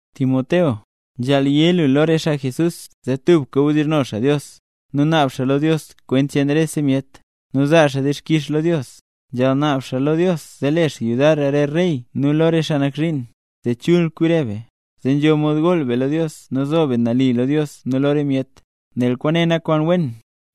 Timoteo, nzhaal yé lu lo re xaa Jesús zee tubka wdizhno xaa Dios, nu naab xaa lo Dios kwent cheen rese myet, nu zaa xaa dixkix lo Dios. Nzhaal naab xaa lo Dios zee le xaa yudar re rey nu lo re xaa nak zhiin, zee chul kwi re be, zee nzho mod gool be lo Dios nu zo be nali lo Dios nu lo re myet. Nel kwaane nak kwaan wen,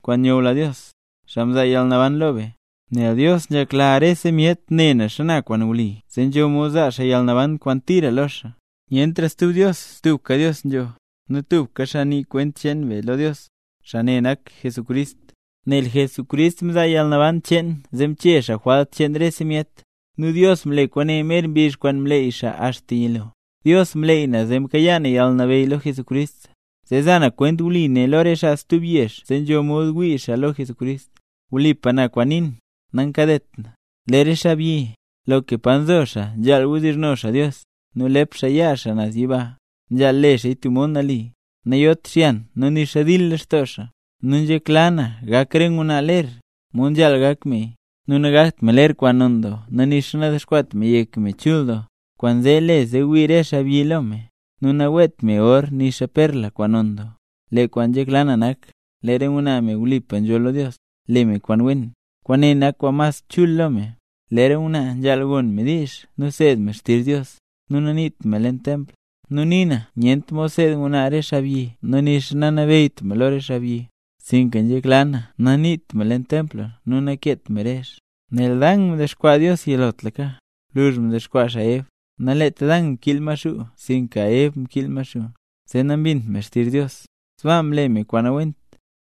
kwaan nyula Dios, xaa mzaa yalnaban lo be. Nel Dios nzhekla rese myet ne cho nak kwaan wli, zee nzho mod zaa xaa yalnaban kwaan tira lo xaa. Nyentra stub Dios tubka Dios nzho, nu tubka xaa nii kwent cheen be lo Dios, xaa ne nak Jesucrist. Nel Jesucrist mzaa yalnaban cheen zee mchee xaa jwalt cheen rese myet, nu Dios mle kwaane mer mbizh kwaan mleey xaa axta yilo. Dios mleey na zee mkayaa yalnabeyy lo Jesucrist, zee za na kwent wli ne lo re xaa stub yezh zee nzho mod wii xaa lo Jesucrist. Wlipa na kwaan nii na, nankadet na. Lee re xaabyi, loka pa nzo xaa nzhaal wdizhno xaa Dios, nu lep xaa yaa xaa naz yiba. Nzhaal le xaaya tub mod nali, nayot xyan nu nixa dil lextoo xaa. Nu nzhekla na gak re ngwnaa ler, mod nzhaal gak meya; nu nagakt me ler kwaan non doo nu nixa nadexkwaat me yek me chul doo, kwaanzee le zee wii re xaabyi lo me. Nu naweet me or nixa perla, kwaan non doo. Lee kwaan nzhekla na nak, lee re ngwnaa, me wlipa nzholl lo Dios, le me kwaan wen, kwaane nak kwaan mas chul lo me. Lee re ngwnaa nzhaal gon me diizh nu nseed me xtizh Dios, nu naniit me leen pa nkasa gu. Nu nii na nyent mod seed ngwnaa re xaabyi nu nixa nanabeyyt me lo re xaabyi, sinka nzhekla na naniit me leen pa nkasa gu nu nakeet me rezh. Nel Dan mdexkwaa Dios yilotlaka, gwluzh mdexkwaa xaa Ev. Naleet Dan mkiil Maxuu sinka Ev mkiil Maxuu, zee nambint me xtizh Dios, sbaa mle me kwaan nawent.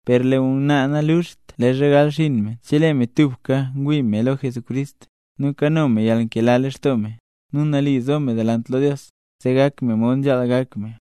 Per lee ngwnaa naluxt leezha gal xinn me chelee me tubka ngwii me lo Jesucrist, nu kano me yalnkela lextoo me, nu nali zo me delant lo Dios, zee gak me mod nzhaal gak me.